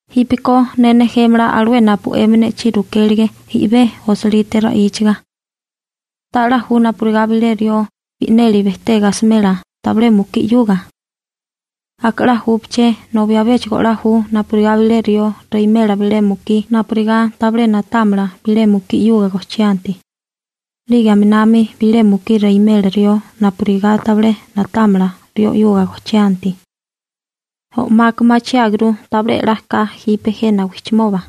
Jípeko ne nejémala alué napu 'emi ne'chí rukélige i'bé osilite ra'íchiga. ¿Ta'lá ju napurigá bilé rió bi'neli bejtega asimela tabilé mukí 'yuga? Aka 'la júpaché nobi abéchigo 'la ju napurigá bilé rió reimela bilé mukí napurigá tabilé na'támala bilé mukí 'yuga gojchianti. 'Lige aminami bilé mukí reimela rió napurigá tabilé na'támala rió 'yuga gojchianti. O'maka machiáguru tabilé 'la ka jipe jena wijchimoba.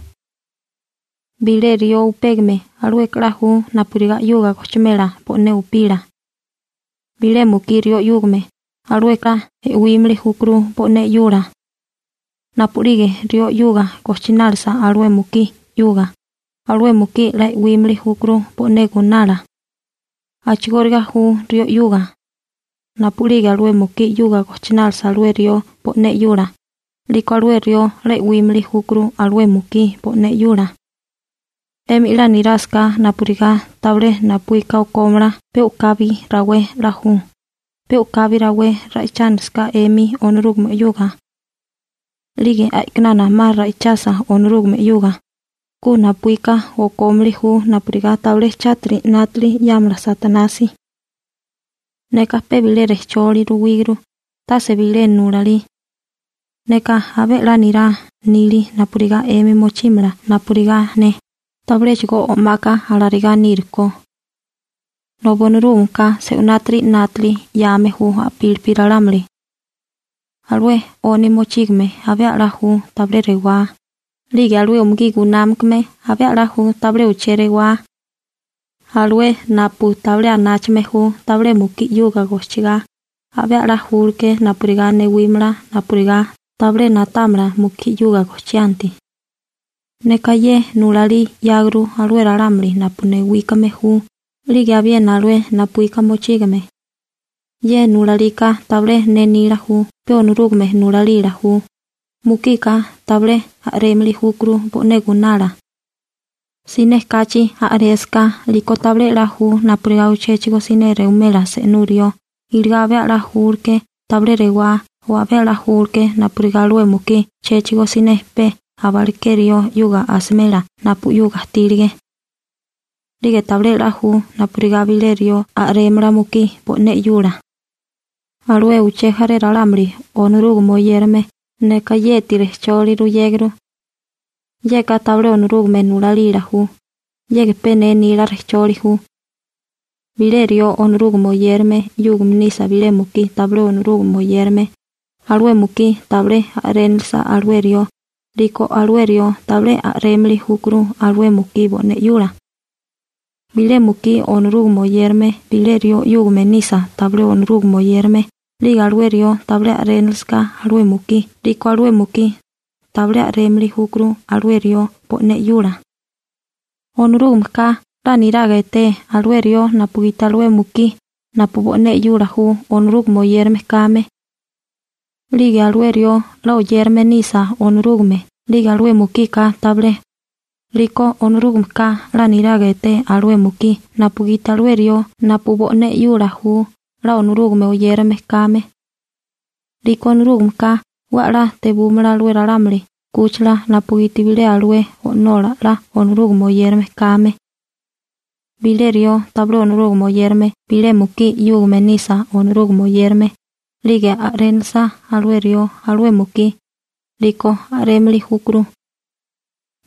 Bilé rió upégame, alueka 'la ju napurigá 'yuga gojchimela bo'né upila. Bilé mukí rió 'yúgame, alueka 'la e'wímili júkuru bo'né 'yula. Napu'lige rió 'yuga gojchinálisa alué mukí 'yuga, alué mukí 'la e'wímili júkuru bo'né gunala. A'chigóriga ju rió 'yuga. Napu'lige alué mukí 'yuga gojchinálisa alué rió bo'né 'yula, 'liko alué rió 'la e'wímili júkuru alué mukí bo'né 'yula. 'Emi 'la nirásaká napurigá tabilé napuíka okómala pe u'kabi rawé 'la ju, pe u'kabi rawé ra'ichánilisaká 'emi Onorúgame 'yuga. 'Lige a'kinana 'ma ra'ichasa Onorúgame 'yuga, ku napuíka okómili ju napurigá tabilé chátiri 'nátili 'yámala Satanasi. Neka pe bilé rejcholi ruwíguru, tase bilé nulalí. Neka abé 'la nirá nili napurigá 'emi mochímala napurigá ne, tabiléchigo o'maka alarigá nírukó. Nobi Onorúgameka se'unátiri 'nátali 'yame ju a'pílipi ralámuli. Alué 'oni mochígame abé 'la ju tabilé rewá, 'lige alué umugí gunámakame abé 'la ju tabilé uché rewá. Alué napu tabilé anáchame ju tabilé mukí 'yuga gojchigá, abé la julke napurigá newímala napurigá tabilé na'támala mukí 'yuga gojchianti. Neka ye nulalí 'yáguru alué ralámuli napu newíkame ju 'lige abiena alué napuíka mochígame. Ye nulalika tabilé ne nila ju, pe Onorúgame nulalila ju: Mukika tabilé a'rémili júkuru bo'né gunala. Siné kachi a'résaká, 'liko tabilé 'la ju napurigá uchéchigo siné rewimela se'nú rió, iligá abé 'la júleké tabilé rewá o abé a'lá júleké ma napurigá alué mukí chéchigo siné pe aba aleké rió 'yuga asimela napu 'yuga ajtílige. 'Lige tabilé 'la ju napurigá bilé rió a'rémala mukí bo'né 'yula. Alué uché jaré ralámuli Onorúgame oyérame, neka yeti rejcholi ruyéguru. Yeka tabilé Onorúgame nulalila ju, yeka pe ne nila rejcholi ju. Bilé rió Onorúgame oyérame 'yúgame nisa bilé mukí tabilé Onorúgame oyérame, alué mukí tabilé a'rénilisa alué rió, 'liko alué rió tabilé a'rémili júkuru alué mukí bo'né 'yula. Bilé mukí Onorúgame oyérame bilé rió 'yúgame nisa tabilé Onorúgame oyérame 'lige alué rió tabilé a'rénilisaká alué mukí 'liko alué mukí tabilé a'rémili júkuru alué rió bo'né 'yula. Onorúgameka 'la niraga eté alué rió napugiti alué mukí napu bo'né 'yula ju Onorúgame oyérame kame. 'Lige alué rió 'la oyérame nisa Onorúgame 'lige alué mukika tabilé, 'liko Onorúgameka 'la niraga eté alué mukí napugiti alué rió napu bo'né 'yula ju 'la Onorúgame oyérame kame. 'Liko Onorúgameka 'we 'la tebúmala alué ralámuli 'kúchila napugiti bilé alué o'nola 'la Onorúgame oyérame kame. Bilé rió tabilé Onorúgame oyérame bilé mukí 'yúgame nisa Onorúgame oyérame, 'lige a'rénilisa alué rió alué mukí, 'liko a'rémili júkuru.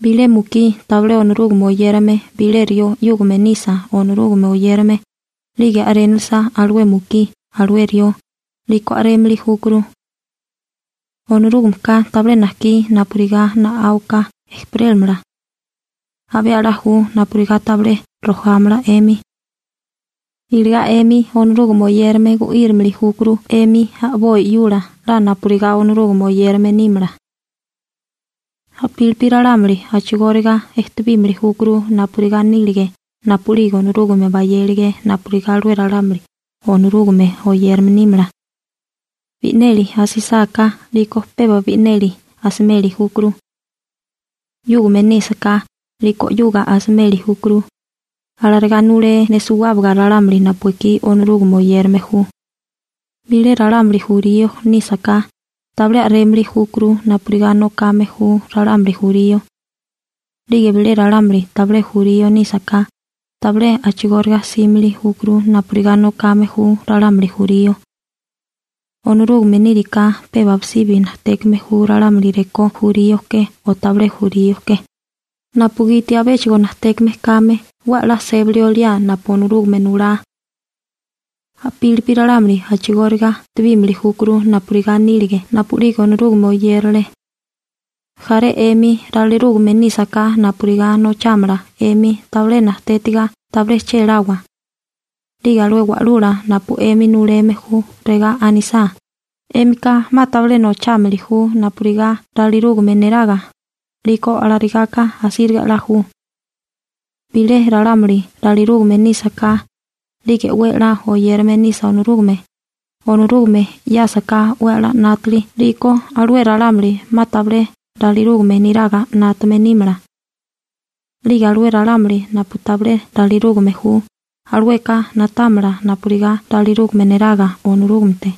Bilé mukí tabilé Onorúgame oyérame bilé rió 'yúgame nisa Onorúgame oyérame, 'lige a'rénilisa alué mukí alué rió, 'liko a'rémili júkuru. Onorúgameka tabilé najkí napurigá na'áwaká ejperélamala. Abé 'la ju napurigá tabilé rojámala 'emi. Iligá 'emi Onorúgame oyérame gu'írimili júkuru 'emi a'boi 'yula 'la napurigá Onorúgame oyérame nímala. A'pílipi ralámuli a'chigóriga ejtebímili júkuru napurigá nílige napu'lige Onorúgame bayélige napurigá alué ralámuli Onorúgame oyérame nímala. Bi'neli asisáká, 'liko peba bi'neli asimeli júkuru. 'Yúgame nísaká 'liko 'yuga asimeli júkuru. Alarigá nulé ne suwábaga ralámuli napu ekí Onorúgame oyérame ju. Bilé ralámuli jurío nísaká, tabilé a'rémili júkuru napurigá nokame ju ralámuli jurío. 'Lige bilé ralámuli tabilé jurío nísaká, tabilé a'chigóriga 'símili júkuru napurigá nokame ju ralámuli jurío. Onorúgame níriká peba abisibi najtékame ju ralámuli rekó jurío ke o tabilé jurío ke, napugiti abéchigo najtékame kame 'we 'la sébali oliá napu Onorúgame nulá. A'pílipi ralámuli a'chigóriga ejtebímili júkuru napurigá nílige napu'lige Onorúgame oyérale. Jaré 'emi ralirúgame nísaká napurigá nochámala 'emi tabilé najtétiga, tabilé chéláwa. 'Lige alué wa'lula napu 'emi nuleme ju regá anisá: «'Émika 'ma tabilé nochámili ju napurigá ralirúgame neraga», 'liko alarigaka asíriga 'la ju. Bilé ralámuli ralirúgame nísaká, 'lige 'we 'la oyérame nisa Onorúgame, Onorúgame 'yásaká 'we 'la 'nátali 'liko alué ralámuli 'ma tabilé ralirúgame niraga 'nátame nímala. 'Lige alué ralámuli napu tabilé ralirúgame ju, alueka na'támala napurigá ralirúgame neraga Onorúgamete.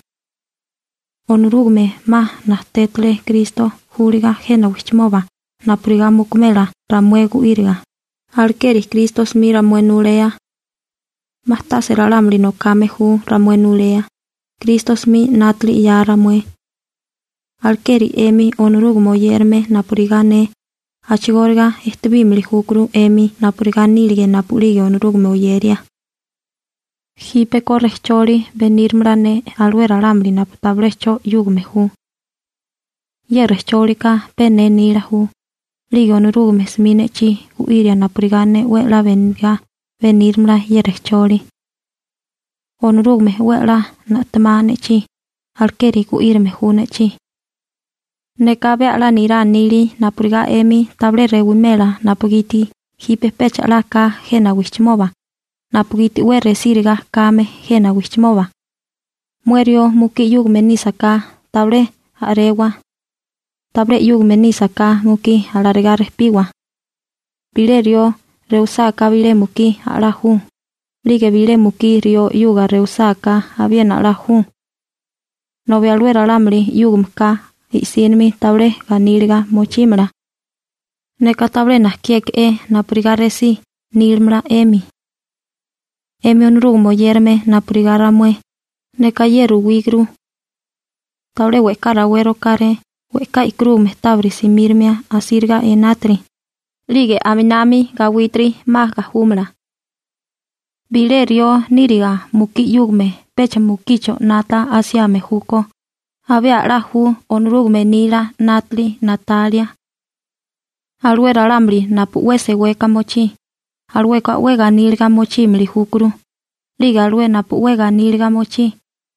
Onorúgame 'ma najtétale Kristo júliga jena wijchimoba napurigá mukumela ramué gu'íriga, alekeri Kristo 'smi ramué nulea. 'Ma tase ralámuli nokame ju ramué nulea, Kristo 'smi 'nátali 'ya ramué. Alekeri 'emi Onorúgame oyérame napurigá ne, a'chigóriga ejtebímili júkuru 'emi napurigá nílige napu'lige Onorúgame oyeria. Jípeko rejcholi benírimala ne alué ralámuli napu tabilé 'cho 'yúgame ju. Ye rejchólika pe ne nila ju, 'lige Onorúgame 'smi ne'chí gu'iria napurigá ne 'we 'la benigá benírimala ye rejcholi. Onorúgame 'we 'la na'temá ne'chí, alekeri gu'írame ju ne'chí. Neka abé 'la nirá nili napurigá 'emi tabilé rewimela napugiti jipe pecha 'la ka jena wijchimoba, napugiti 'we resíriga kame jena wijchimoba. Mué rió mukí 'yúgame nísaká, tabilé a'rewa. Tabilé 'yúgame nísaká mukí alarigá rejpiwa. Bilé rió mukí rewisá, a'lá ju, 'lige bilé mukí rió rewisá abiena 'la ju. Nobi alué ralámuli 'yúgameka i'sínimi tabilé ganíliga mochímala. Neka tabilé najkiéke'é napurigá resí nílamala 'emi. 'Emi Onorúgame oyérame napurigá ramué, neka ye ruwíguru. Tabilé we'ká rawé rokáré we'ká e'karúgame tábiri simírimia asíriga enátiri, 'lige aminami gawítiri 'ma gajúmala. Bilé rió níriga mukí 'yúgame pecha mukicho 'nata asiame júkó, abé 'la ju Onorúgame nila 'nátali na'talia. Alué ralámuli napu 'we seweka mochí, alueka 'we ganíliga mochímili júkuru, 'lige alué napu 'we ganíliga mochí,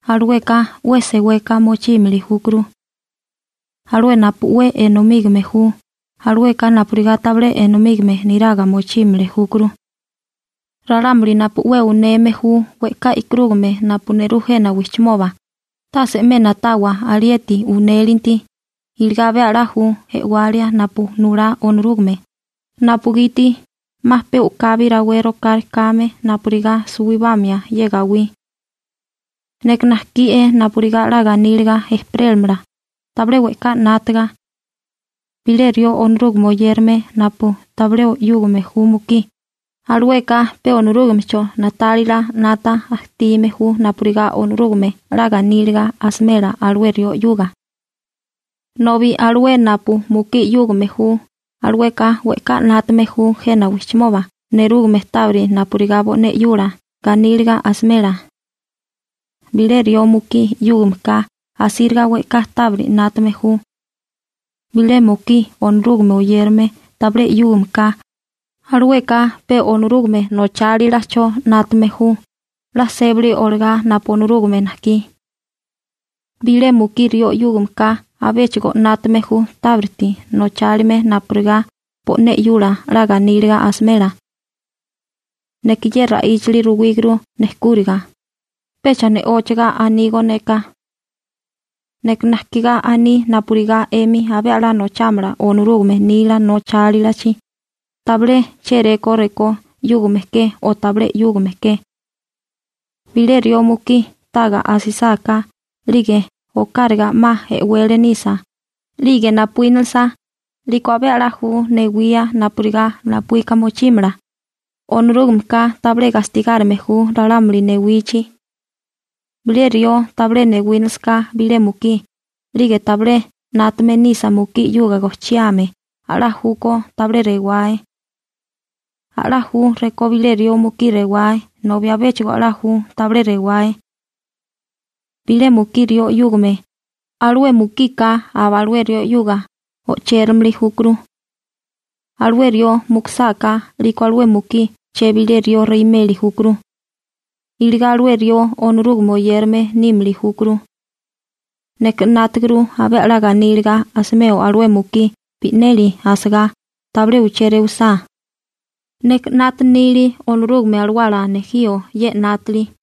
alueka 'we seweka mochímili júkuru. Alué napu 'we enomígame ju, alueka napurigá tabilé enomígame niraga mochímili júkuru. Ralámuli napu 'we uneme ju we'ká e'karúgame napu nerú jena wijchimoba, tase 'me na'tawa alieti unélinti, iligá abé 'la ju e'walia napu nulá Onorúgame, napugiti 'ma pe u'kabi rawé rokáré kame napurigá suwibamia ye gawí. Neka najkié napurigá 'la ganíliga ejperélamala, tabilé we'ká 'nátaga. Bilé rió Onorúgame oyérame napu tabilé 'yúgame ju mukí, alueka pe Onorúgamecho na'tálila 'nata ajtime ju napurigá 'la ganíliga asimela alué rió 'yuga. Nobi alué napu mukí 'yúgame ju, alueka we'ká 'nátame ju jena wijchimoba nerúgame tábiri napurigá bo'né 'yula ganíliga asimela. Bilé rió mukí 'yúgameka asíriga we'ká tábiri 'nátame ju. Bilé mukí Onorúgame oyérame tabilé 'yúgameka, alueka pe Onorúgame nochálilacho 'nátame ju 'la sébali olagá napu Onorúgame najkí. Bilé mukí rió 'yúgameka abéchigo 'nátame ju tábiriti nochálime napurigá bo'né 'yula 'la ganíliga asimela. Neka ye ra'íchali ruwíguru nejkúriga, pecha ne'óchaga anígó neka. Neka najkigá aní napurigá 'emi abé 'la nochámala Onorúgame nila nochálilachi, tabilé chéré rekó 'yúgame ke o tabilé 'yúgame ke. Bilé rió mukí taga asisáká, 'lige okáraga 'ma e'wele nisa, 'lige napuínilisa, 'liko abé 'la ju newía napurigá napuíka mochímala, Onorúgameka tabilé gastigárime ju ralámuli newichi. Bilé rió tabilé rewinálisaká bilé mukí, 'lige tabilé 'nátame nisa mukí 'yuga gojchiame a'lá ju rekó tabilé rewae. A'lá ju rekó bilé rió mukí rewae nobi abéchigo a'lá júkó tabilé rewae. Bilé mukí rió 'yúgame, alué mukika aba alué rió 'yuga o'chérimili júkuru. Alué rió mukusáká 'liko alué mukí chebilé rió reimeli júkuru. Iligá alué rió Onorúgame oyérame nímili júkuru. Neka 'nátaguru abé 'la ganíliga asimeo alué mukí bi'neli asagá, tabilé uché rewisá. Neka mayé nili Onorúgame Alawala nejío ye 'nátali.